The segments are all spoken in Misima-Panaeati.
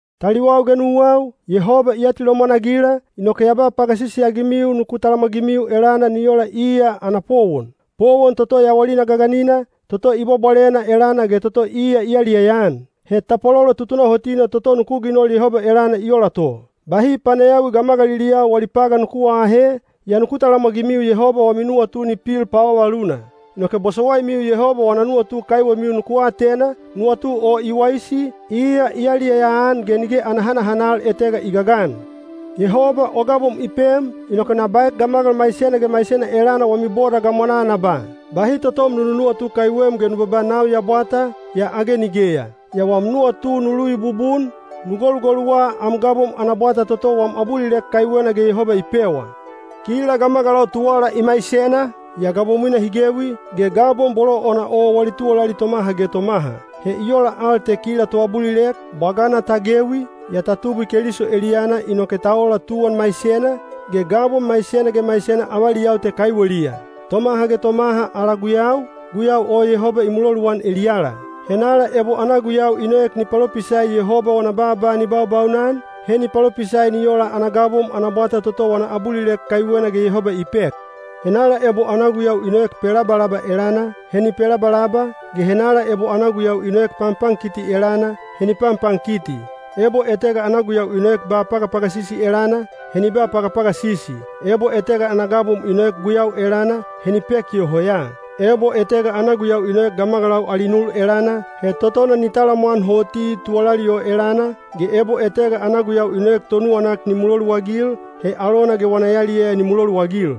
Taliwau ge nuwau, Yehoba i atilomwan-agila, inoke ya ba pagasisi-agimiu nuku talamwagimiu elana ni ola iya ana powon, powon toto yawalina gaganina, toto i bwabwalena elana ge toto iya i yaliyaya-an. He tapwalolo tutunahotina toto nuku ginol Yehoba elana i ola to. Bahi panayawi gamagaliliyau wali pagan nuku aahe, yaa nuku talamwagimiu Yehoba wami nuwatu ni pil pavavaluna. Inoke bosowaimiu Yehoba wana nuwatu kaiwemiu nuku atena, nuwatu o i waisi, iya i yaliyaya-an ge nige ana hanahanal etega i gagan. Yehoba o gabom i pem, inoke na baek gamagal maisena ge maisena elana wami boda gamwanaa na ba: bahi totom nu nunuwatu kaiwem ge nu babaa “Nau ya bwata,” yaa age nigeya. Yaa wam nuwatu nu luvi bubun, nu golugoluwa am gabom ana bwata toto wam abulilek kaiwena ge Yehoba i pewa. Kila gamagalau tuwala i maisena, yaa gabomwina hi gewi, ge gabom bolo ona o wali tuwalali tomaha ge tomaha. He i ola al te kila toabulilek, bwagana ta gewi, yaa ta tubwi Keliso eliyana inoke ta ola tuwan maisena, ge gabom maisena ge maisena avaliyau te kaiweliya. Tomaha ge tomaha ala guyau, guyau o Yehoba i muloluan eliyala. Henala ebo ana guyau i noek ni palopisai Yehoba wana baaba ni baubaunan, he ni palopisai ni ola ana gabom ana bwata toto wana abulilek kaiwena ge Yehoba i pek. Henala ebo ana guyau i noek pelabalaba elana, he ni pelabalaba, ge henala ebo ana guyau i noek panpankiti elana, he ni panpankiti. Ebo etega ana guyau i noek ba pagapagasisi elana, he ni ba pagapagasisi. Ebo etega ana gabom i noek guyau elana, he ni pek yoho ya. Ebo etega ana guyau i noek gamagalau ali nul elana, he totona ni talamwan hoti tuwalali o elana, ge ebo etega ana guyau i noek tonuwanak ni muloluagil, he alona ge wana yaliyaya ni muloluagil.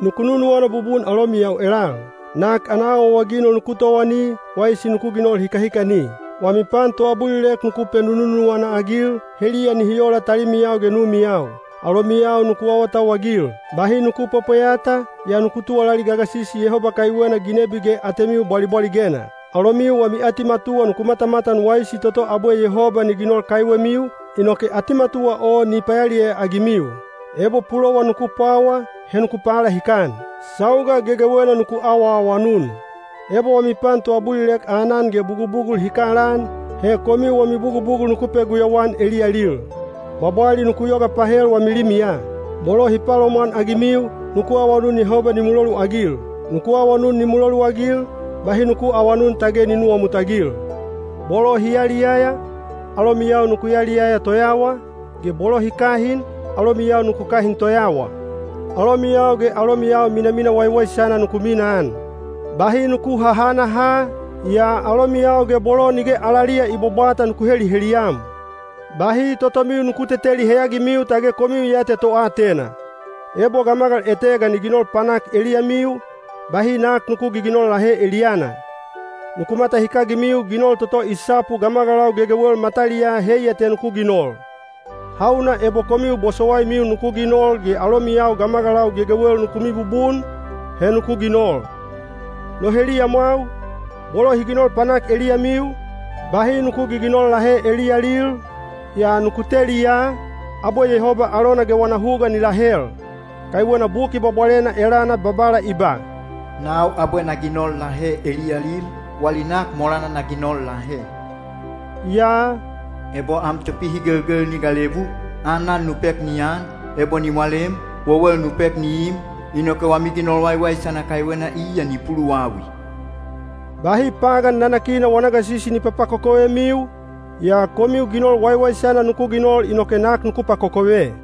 Nuku nunuwana bubun alomiyau elal. Nak ana awaawaginol nuku towani, waisi nuku ginol hikahikani. Wami pan toabulilek nuku penununuwana-agil, heliya nihi ola talimiyau ge numiyau. Alomiyau nuku awatauwagil. Bahi nuku pwepweyata, yaa nuku tuwalali gagasisi Yehoba kaiwena ginebi ge atemiu bwalibwaligena. Alomiu wami atimatuwa nuku matamatan waisi toto abwe Yehoba ni ginol kaiwemiu, inoke atimatuwa o ni payaliyaya-agimiu. Ebo pulowan nuku pwawa, he nuku palahikan. Sauga gegewena nuku awaawanun. Ebo wami pan toabulilek aanan ge bugubugul hi kalaan, he komiu wami bugubugul nuku peguyau-an eliyalil. Bwabwali nuku yoga pahel wami limiya. Bolo hi palomwanagimiu, nuku awanun Yehoba ni muloluagil. Nuku awanun ni muloluagil, bahi nuku aawanun tage ni nuwamutagil. Bolo hi yaliyaya, alomiyau nuku yaliyaya toyawa, ge bolo hi kahin, alomiyau nuku kahin toyawa. Alomiyau ge alomiyau minamina waiwaisana nuku minaan. Bahi nuku hahanaha, yaa alomiyau ge bolo nige alaliya i bwabwata nuku heliheliyam. Bahi totomiu nuku teteli heyagimiu tage komiu ya te toatena. Ebo gamagal etega ni ginol panak eliyamiu, bahi nak nuku giginol lahe eliyana. Nuku matahikagimiu ginol toto i sapu gamagalau gegewel mataliyaa heiya te nuku ginol. Hauna ebo komiu bosowaimiu nuku ginol ge alomiyau gamagalau gegewel nuku mibubun, he nuku ginol. No heliyamwau, bolo hi ginol panak eliyamiu, bahi nuku giginol lahe eliyalil, yaa nuku teli ya, abwe Yehoba alona ge wana huga ni lahel. Kaiwena Buki Bwabwalena elana Babala i ba, “Nau abwe na ginol lahe eliyalil, wali nak molana na ginol lahe.” Yaa “ebo am topihigelgel ni galebu, aanan nu pek ni an, ebo ni walem, wewel nu pek ni im, inoke wami ginol waiwaisana kaiwena iya ni puluwawi.” Bahi pagan nanakina wana gasisi ni papakokovemiu, yaa komiu ginol waiwaisana nuku ginol inoke nak nuku pakokove.